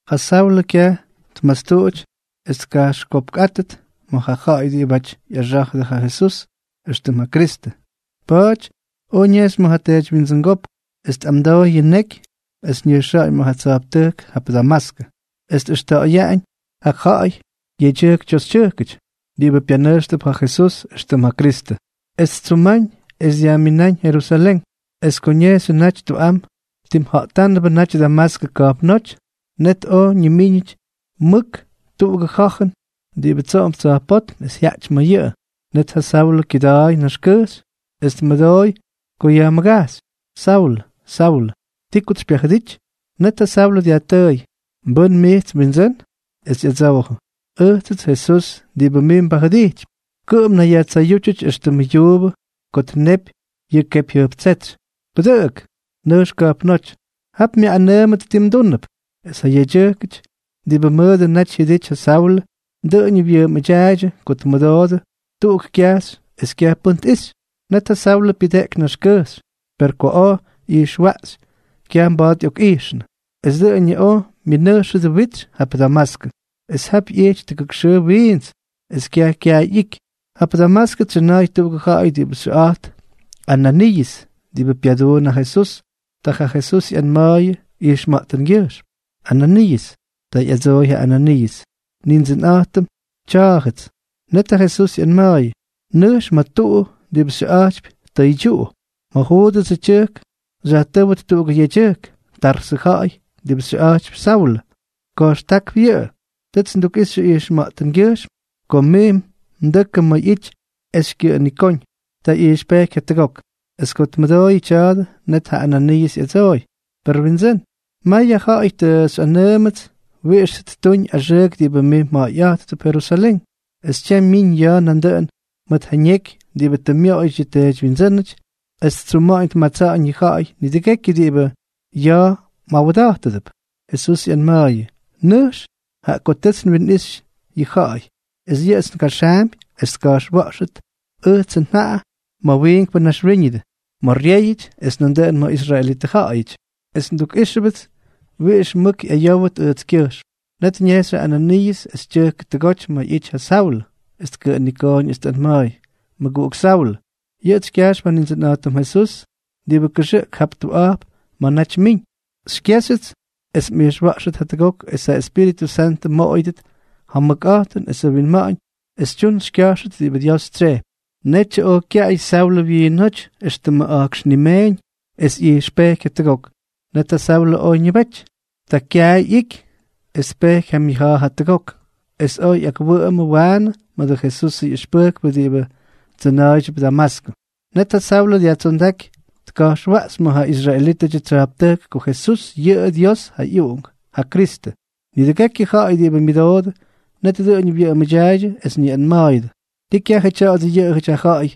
Ja Saulʉ kyaj tmastuꞌuty es tkajxykyopkꞌátʉt ma̱ ja ja̱ꞌa̱y diꞌibáty ꞌyaxá̱jʉdʉ ja Jesús éxtʉm ja Kristʉ. Pa̱a̱ty oj ñejxy ma̱ ja teedywyindsʉngópk, es tꞌamdooy yʉ ñeky es ñʉjxa̱ꞌa̱ñ ma̱ ja tsa̱jptʉjk jap Damaskʉ, es tꞌʉxta̱ꞌa̱yaꞌañ ja ja̱ꞌa̱y, yedyʉjk toxytyʉjkʉty, diꞌibʉ pyanʉjxtʉp ja Jesús éxtʉm ja Kristʉ, es ttsuma̱ꞌa̱ñ es dyajmina̱ꞌa̱ñ Jerusalén. Es ko ñejxyʉ naty tuꞌam, timja̱ꞌtánʉbʉ naty Damaskʉ ka̱jpnóty, net oj ñimíñʉty mʉk tuꞌugʉ ja̱jʉn diꞌibʉ tsoꞌomp tsa̱jpótm es jyaꞌty ma̱ yʉꞌʉ. Net ja Saulʉ kyʉda̱a̱y naxkʉjxy, es tmʉdooy ko yajmʉgajxy: —Saulʉ, Saulʉ, ¿ti kots xypyajʉdity? Net ja Saulʉ dyajtʉʉy: —¿Mbʉ́n mijts, Windsʉ́n? Es ꞌyadsoojʉ: —Ʉjtsʉts Jesús diꞌibʉ mij mbajʉdijtypy. Kʉꞌʉm mnayyajtsayútyʉty éxtʉmʉ yuubʉ ko tnepy yʉ kepyjyʉjptsétsy. Pʉdʉꞌʉk. Nʉjx ka̱jpnóty. Jap myaꞌꞌanʉʉmʉt ti mdúnʉp. Es ja yedyʉjkʉty diꞌibʉ mʉdʉ naty jyʉdity ja Saulʉ, dʉꞌʉñʉ wyʉꞌʉmʉdyaaydyʉ ko tmʉdoodʉ tuꞌuk kyajxy es kyaj pʉ́n tꞌijxy. Net ja Saulʉ pyʉdeꞌky naxkʉjxy, per ko oj ꞌyijxwaꞌxy, kyaj mba̱a̱t ꞌyokꞌijxnʉ. Es dʉꞌʉñʉ oj myʉnʉjxʉdʉ witsy jap Damaskʉ. Es jap ꞌyijty tʉgʉk xʉʉ wiints, es kyaj kyay ꞌyiiky. Jap Damaskʉ tsyʉna̱a̱y tuꞌugʉ ja̱ꞌa̱y diꞌibʉ xyʉꞌa̱jt Ananiiʉs, diꞌibʉ pyaduun ja Jesús. Ta ja Jesús ꞌyanma̱a̱yʉ ijxma̱ꞌtʉngyʉjxm: —¡Ananiiʉs! Ta ꞌyadsooy ja Ananiiʉs: —Nindsʉnꞌa̱jtʉm, tya̱a̱jʉts. Net ja Jesús ꞌyanma̱a̱yʉ: —Nʉjx ma̱ tuꞌu diꞌibʉ xyʉꞌa̱jtypy Tʉydyuꞌu. Ma̱ Juudʉsʉ tyʉjk xyajtʉ́wʉt tuꞌugʉ yedyʉjk, Tarsʉ ja̱ꞌa̱y diꞌibʉ xyʉꞌa̱jtypy Saulʉ. Ka̱jxtákp yʉꞌʉ. Tʉts ndukꞌixy ijxma̱ꞌtʉngyʉjxm ko mij mdʉkʉ ma̱ ꞌyity es xykyʉꞌʉnikóñ. Ta ꞌyijxpejky jatʉgok. Es ko tmʉdooyʉ tya̱a̱dʉ, net ja Ananiiʉs ꞌyadsooy: —Per Windsʉ́n, may ja ja̱ꞌa̱y tʉ xyꞌanʉʉmʉts wiꞌix tʉ ttuñ axʉʉk diꞌibʉ mij mja̱ꞌa̱yꞌa̱jttʉp Jerusalén. Es tyam myiñ ya̱a̱ nandʉꞌʉn mʉt ja ñeky diꞌibʉ tʉ myoꞌoyʉty yʉ teedywyindsʉ́nʉty, es ttsuma̱ꞌa̱ñ tmatsa̱ꞌa̱ñ yʉ ja̱ꞌa̱y nidʉgekyʉ diꞌibʉ ya̱a̱ mꞌawda̱jttʉp. Jesús ꞌyanma̱a̱yʉ: —Nʉjx, jaꞌa ko tʉts nwinꞌixy yʉ ja̱ꞌa̱y es yʉꞌʉts ngaxaampy es tka̱jxwa̱ꞌxʉt ʉjtsʉ njaꞌa ma̱ wiinkpʉ naxwíñʉdʉ, ma̱ ryéyʉty, es nandʉꞌʉn ma̱ israelitʉ ja̱ꞌa̱yʉty. Es ndukꞌíxʉpts wiꞌix mʉk ꞌyayówʉt ʉjtskyʉjxm. Net ñejxy ja Ananiiʉs es tyʉjkʉ tʉgoty ma̱ ꞌyity ja Saulʉ, es tkʉꞌʉnikooñ es tꞌanma̱a̱y: —Mʉguꞌuk Saulʉ, yʉꞌʉts xykyajxp ja Nindsʉnꞌa̱jtʉm Jesús diꞌibʉ kʉxʉꞌk jap tuꞌa̱jp ma̱ naty mmiñ. Xykyéxyʉts es mꞌijxwa̱ꞌxʉt jatʉgok es ja Espíritʉ Santʉ mmoꞌoyʉdʉt ja mʉkꞌa̱jtʉn esʉ winma̱ꞌa̱ñ es xytyun xykya̱jxʉt diꞌibʉ Dios tsyejpy. Netyʉ oj kyaꞌay Saulʉ wyiinóty éxtʉmʉ a̱jkx nimeeñ, es ꞌyijxpejky jatʉgok. Net ja Saulʉ oj ñʉbety. Ta kyaay ꞌyiky es tpejky ja myʉja̱a̱ jatʉgok, es oj ꞌyakwʉꞌʉmʉ waanʉ mʉdʉ Jesusʉ ꞌyʉxpʉjkpʉ diꞌibʉ tsʉna̱a̱ydyʉp Damaskʉ. Net ja Saulʉ dyajtsondáky tka̱jxwaꞌxy ma̱ ja israelítʉdyʉ tsya̱jptʉjk ko Jesús yʉꞌʉ Dios ja ꞌyUꞌunk, ja Kristʉ. Nidʉgekyʉ ja̱ꞌa̱y diꞌibʉ myʉdoodʉ, net dʉꞌʉñʉ wyʉꞌʉmʉdyaaydyʉ, es ñayꞌanma̱a̱yʉdʉ: —¿Tii kyajʉ tya̱a̱dʉ yʉꞌʉjʉty ja ja̱ꞌa̱y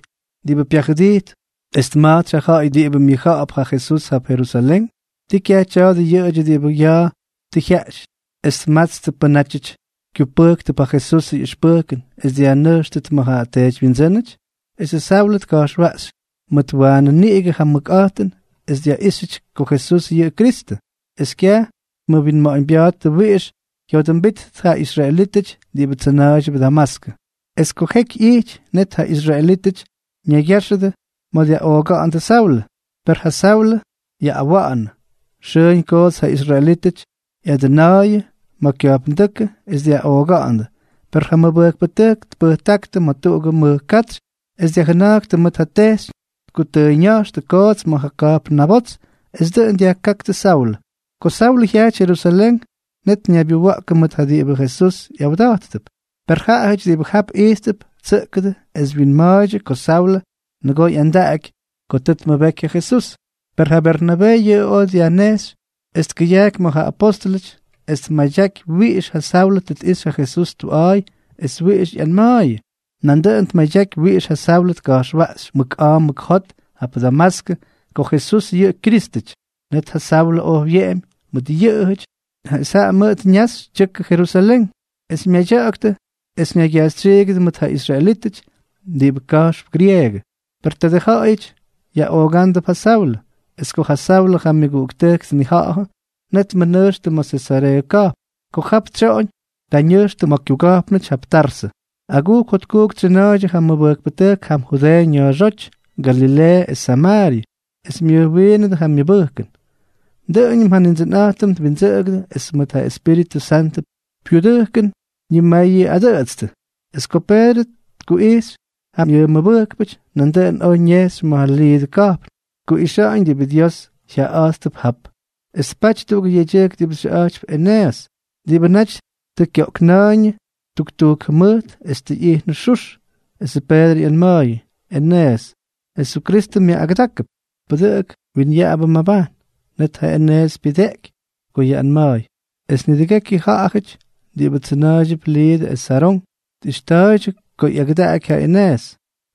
diꞌibʉ pyajʉdijt es tma̱jtsy ja ja̱ꞌa̱y diꞌibʉ myʉjja̱ꞌa̱p ja Jesús jap Jerusalén? ¿Tii kyaj tya̱a̱dʉ yʉꞌʉdyʉ diꞌibʉ ya̱a̱ tʉ jyaꞌty es tmátstʉt pʉ́nʉty kyupʉjktʉp ja Jesusʉ ꞌyʉxpʉjkʉn es dyajnʉjxtʉt ma̱ ja teedywyindsʉ́nʉty? Esʉ Saulʉ tka̱jxwaꞌxy mʉt waanʉ niꞌigʉ ja mʉkꞌa̱jtʉn es dyaꞌíxyʉty ko Jesús yʉꞌʉ Kristʉ. Es kyaj tmʉwinma̱ꞌa̱ñbya̱a̱ttʉ wiꞌix ꞌyadsoojʉmbíttʉt ja israelítʉty diꞌibʉ tsʉna̱a̱ydyʉp Damaskʉ. Es ko jeky ꞌyijty, net ja israelítʉty ñaygya̱jxʉdʉ es dyaꞌooga̱ꞌa̱ndʉ Saulʉ, per ja Saulʉ yaꞌꞌawa̱ꞌa̱nʉ. Xʉʉñ koots ja israelítʉty ꞌyadʉna̱a̱yʉ ma̱ kya̱jpndʉ́kʉ es dyaꞌooga̱ꞌa̱ndʉ, per ja mʉbʉjkpʉtʉjk tpʉjtáktʉ ma̱ tuꞌugʉ mʉj katsy es dyajjʉna̱jktʉ mʉt ja tejxyñ, tkutʉʉyña̱jxtʉ koots ma̱ ja ka̱jpn nabots. Es dʉꞌʉn dyajkáktʉ Saulʉ. Ko Saulʉ jyajty Jerusalén, net ñaybyuwa̱ꞌkʉ mʉt ja diꞌibʉ Jesús ꞌyawda̱jttʉp. Per ja ja̱ꞌa̱y diꞌibʉ jap ijttʉp, tsʉꞌkʉdʉ es wyinma̱a̱ydyʉ ko Saulʉ nʉgoo ꞌyandaꞌaky ko tʉ tmʉbeky ja Jesús. Per ja Bernabee yʉꞌʉ oj dyajnejxy es tkʉyajky ma̱ ja apóstʉlʉty es tmadyaky wiꞌix yʉ Saulʉ tʉ tꞌixy ja Jesús tuꞌa̱a̱y es wiꞌixʉ ꞌyanma̱a̱yʉ. Nandʉꞌʉn tmadyaky wiꞌix ja Saulʉ tka̱jxwaꞌxy mʉk a̱a̱ mʉk jot jap Damaskʉ ko Jesús yʉꞌʉ Kyrístʉty. Net ja Saulʉ oj wyeꞌemy mʉt yʉꞌʉjʉty, es jaꞌa mʉʉt ñaxy tyʉkʉ Jerusalén, es myadya̱ꞌa̱ktʉ es ñaygyajxytsyiigʉdʉ mʉt ja israelítʉty diꞌibʉ ka̱jxp grieegʉ. Per tadʉ ja̱ꞌa̱yʉty yaꞌoogándʉp ja Saulʉ. Es ko ja Saulʉ ja myʉguꞌuktʉjk tnija̱ꞌa̱dʉ, net tmʉnʉjxtʉ ma̱ Sesareeʉ ka̱jpn. Ko jap tsyoꞌoñ, ta ñʉjxnʉ ma̱ kyuga̱jpnʉty jap Tarsʉ. Agujk jotkujk tsyʉna̱a̱ydyʉ ja mʉbʉjkpʉtʉjk jam Judeeʉ ña̱a̱xóty, Galileeʉ es Samaaryʉ, es myʉjwiinʉdʉ ja myʉbʉjkʉn. Dʉꞌʉñʉm ja Nindsʉnꞌa̱jtʉm twindsʉꞌʉgʉdʉ, es mʉt ja Espíritʉ Santʉ pyudʉjkʉn ñimayʉꞌadʉꞌʉtstʉ. Es ko Peedrʉ tkuꞌijxy ja myʉmʉbʉjkpʉty, nandʉꞌʉn oj ñejxy ma̱ Liidʉ ka̱jpn tkuꞌixa̱ꞌa̱ñ diꞌibʉ Dios jyaꞌayꞌa̱jttʉp jap. Es tpaty tuꞌugʉ yedyʉjk diꞌibʉ xyʉꞌa̱jtypy Eneeʉs, diꞌibʉ naty tʉ kyoꞌkna̱a̱yñʉ tuktujk jʉmʉjt es tʉ ꞌyijnʉ xux. Esʉ Peedrʉ ꞌyanma̱a̱yʉ: —Eneeʉs, Jesukristʉ myaꞌꞌagʉdákʉp. Pʉdʉꞌʉk. Winyaꞌabʉ mmabajn. Net ja Eneeʉs pyʉdeꞌky ko yaꞌꞌanma̱a̱y. Es nidʉgekyʉ ja̱ꞌa̱yʉty diꞌibʉ tsʉna̱a̱ydyʉp Liidʉ es Sarón tꞌijxta̱a̱ydyʉ ko ꞌyagʉdaꞌaky ja Eneeʉs.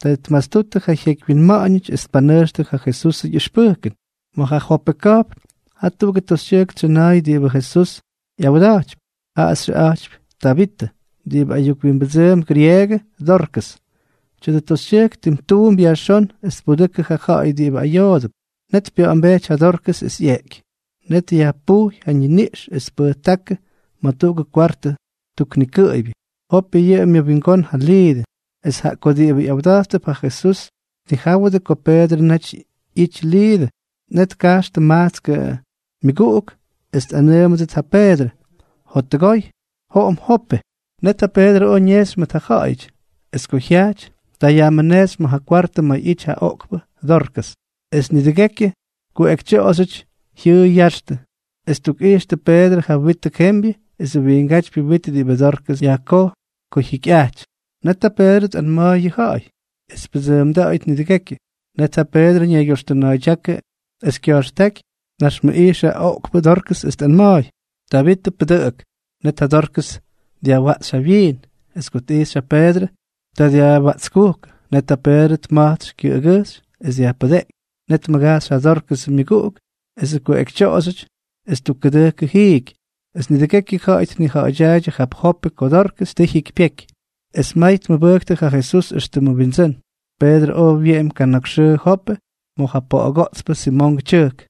Ta tmastuttʉ ja jyeky winma̱ꞌa̱ñʉty, es tpanʉjxtʉ ja Jesusʉ ꞌyʉxpʉjkʉn. Ma̱ ja Jope ka̱jpn, jaa tuꞌugʉ toxytyʉjk tsyʉna̱a̱y diꞌibʉ Jesús ꞌyawda̱jtypy. Jaꞌa xyʉꞌa̱jtypy Tabitʉ, diꞌibʉ ayuk wimbʉdsʉʉmp grieegʉ Dorkʉs. Tya̱dʉ toxytyʉjk tim tuump yajxón es tpudʉkʉ ja ja̱ꞌa̱y diꞌibʉ ayoodʉp. Net pya̱ꞌa̱mbejty ja Dorkʉs es ꞌyeꞌky. Net yajpujy ja ñiniꞌx es tpʉjtákʉ ma̱ tuꞌugʉ kwartʉ tuk nikʉꞌʉybyʉ. Jope yʉꞌʉ myʉwingón ja Liidʉ. Es jaꞌa ko diꞌibʉ ꞌyawda̱jttʉp ja Jesús tnijáwʉdʉ ko Peedrʉ naty ꞌyity Liidʉ, net tkajxtʉ majtskʉ myʉguꞌuk es tꞌanʉʉmʉdʉt ja Peedrʉ: —Jottʉgoy, joꞌom Jope. Net ja Peedrʉ oj ñejxy mʉt ja ja̱ꞌa̱yʉty. Es ko jyajty, ta yajmʉnejxy ma̱ ja kwartʉ ma̱ ꞌyity ja oꞌkpʉ Dorkʉs. Es nidʉgekyʉ kuꞌekytyoꞌoxyʉty jyʉꞌʉy ya̱ꞌa̱xtʉ, es ttukꞌijxtʉ Peedrʉ ja witʉ jembyʉ esʉ wiingátypyʉ wit diꞌibʉ Dorkʉs yajkojy ko jyikyꞌajty. Net ja Peedrʉ tꞌanma̱a̱y yʉ ja̱ꞌa̱y es pyʉdsʉʉmda̱ꞌa̱yʉt nidʉgekyʉ. Net ja Peedrʉ ñaygyoxtʉna̱a̱ydyákʉ es kya̱jxtáky, tnaxmʉꞌijxʉ ja oꞌkpʉ Dorkʉs es tꞌanma̱a̱y: —Tabitʉ, pʉdʉꞌʉk. Net ja Dorkʉs dyajwaꞌxy ja wyiin. Es ko tꞌijxy ja Peedrʉ, ta wyaꞌtskujkʉ. Net ja Peedrʉ tma̱jtsy kyʉꞌʉgʉjxy es dyajpʉdeꞌky. Net tmʉgajxy ja Dórkʉsʉ myʉguꞌuk esʉ kuꞌekytyoꞌoxyʉty, es ttukkʉdʉjkʉ jiiky. Es nidʉgekyʉ ja̱ꞌa̱y tnija̱ꞌa̱dyaaydyʉ jap Jope ko Dorkʉs tʉ jyikypyeky, es may tmʉbʉjktʉ ja Jesús éxtʉmʉ Wyindsʉ́n. Peedrʉ oj wyeꞌemy kana̱k xʉʉ Jope ma̱ ja poꞌogoꞌtspʉ Simongʉ tyʉjk.